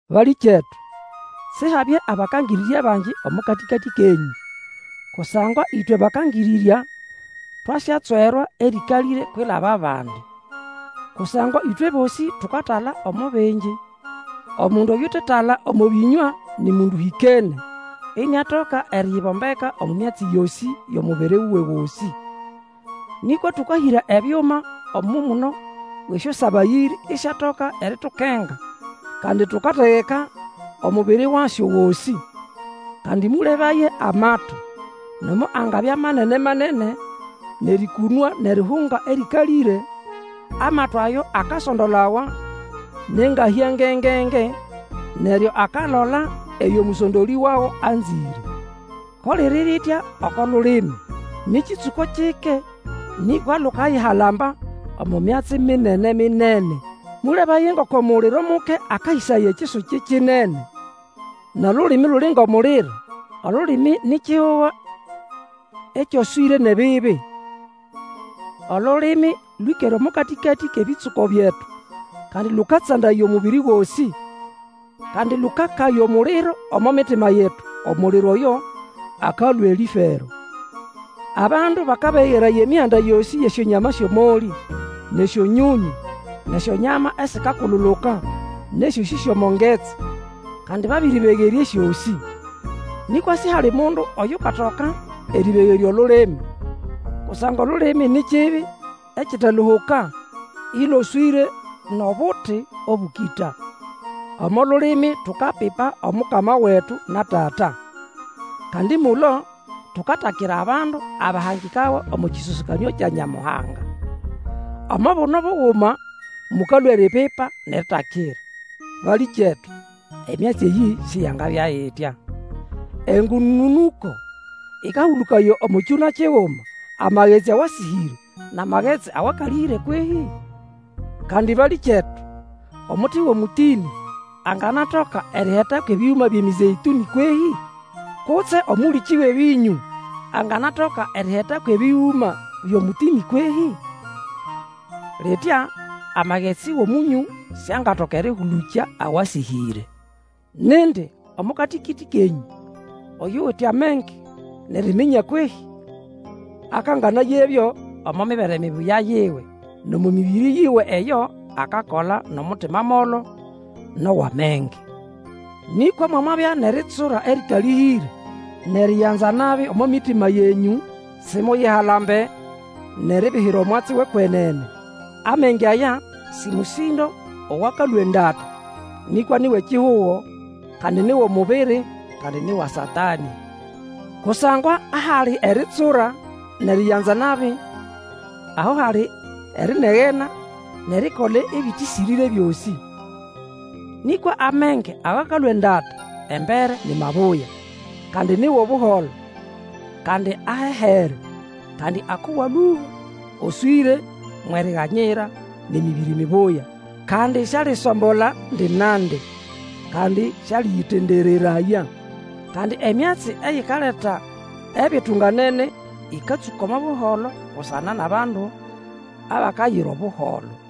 Balĩkyetu, Sihabye abakangĩrĩrya bangi omo katĩkatĩ kenyũ, kusangwa ĩtwe bakangĩrĩrya twasyatswerwa erĩkalĩre kwilaba bandi. Kusangwa ĩtwe bosĩ tukatala omo bingi. Omundu oyutetala omo bĩnywa ni mundu ũhĩkene, iniatoka eriyibombeka omo myatsi yosĩ yʼomubiri wuwe gosĩ. Nĩkwa tũkahĩra ebyuma omo muno wʼesyosabayĩrĩ isyatoka eritukenga, kandi tukategeka omubiri wasyo gosĩ. Kandi mũlebaye amato, nomo angabya manene-manene nʼerĩkũnwa nʼerihunga erĩkalĩre, amato ayo akasondolawa nʼengahya nge-nge-nge, neryo akalola eyo mũsondolĩ wago anzĩre. Ko liri ritya oko lulimi. Nĩ kĩtsũko kyike nĩkwa lukayihalamba omo myatsi minene-minene. Mũlebaye ngoko muliro muke akahĩsaya ekisuki kinene! Nʼolulimi luli ngʼomuliro, olulimi ni kihugo ekyoswĩre nʼebibi. Olulimi lwĩkere omo katĩkatĩ kʼebĩtsũko byetu, kandi lũkatsandaya omubiri gosĩ. Kandi lũkakaya omuliro omo mitima yetu, omuliro oyo akalũa elĩfero. Abandu bakabegeraya emihanda yosĩ yʼesyonyama esyʼomolĩ, nʼesyonyonyũ, nʼesyonyama esikakululuka, nʼesyosĩ syʼomo ngetsi, kandi babĩrĩbegerya esyosĩ. Nĩkwa sihali mundu oyukatoka erĩbegerya olulimi. Kusangwa olulimi ni kibi ekiteluhuka, ĩloswĩre nʼobuti obũkĩta. Omo lulimi tukapipa Omukama wetu na Tata; kandi mulo tukatakira abandu abahangikawa omo kĩsosekanĩo kya Nyamuhanga! Omo buno buguma mũkalũa eripipa nʼeritakira. Balĩkyetu, emyatsi eyĩ siyangabya itya! Engũnũnũko ĩkahũlũkaya omo kyũna kiguma amagetsi awasĩhĩre, nʼamagetsi awakalĩhĩre kwehĩ? Kandi balĩkyetu, omuti wʼomũtĩnĩ anganatoka eriheta kwʼebĩgũma byʼemĩzeĩtũnĩ kwehĩ? Kutse omũlĩkĩ wʼebĩnyũ anganatoka eriheta kwʼebĩgũma byʼomũtĩnĩ kwehĩ? Litya amagetsi wʼOmũnyũ siangatoka erĩhũlũkya awasĩhĩre. Nindi omo katĩkatĩ kenyũ oyuwite amenge nʼeriminya kwehĩ? Akanganayebyo omo mibere mibuya yiwe, nʼomo mĩbĩrĩ yiwe eyo akakola nʼomutima molo, nʼowʼamenge. Nĩkwa mwamabya nʼeritsura erĩkalĩhĩre, nʼeriyanza nabi omo mitima yenyũ, Simuyihalambe nʼeribihira omwatsi wʼekwenene. Amenge aya sĩ mũsĩndo owakalũa endata, nĩkwa ni wʼekihugo, kandi ni wʼomubiri, kandi ni wa Satanĩ. Kusangwa ahali eritsura nʼeriyanza nabi, aho hali erinegena nʼerikola ebĩtĩsĩrĩre byosĩ. Nĩkwa amenge awakalũa endata, embere ni mabuya; kandi ni wʼobuholo, kandi ahehere, kandi akowa lũba, oswĩre mwʼeriganyira, nʼemĩbĩrĩ mibuya; kandi sialisombola ndi nandi, kandi sĩalĩyĩtendereraya. Kandi emyatsi eyikaleta ebitunganene ĩkatsũka omo buholo busana nʼabandu abakayira Obuholo.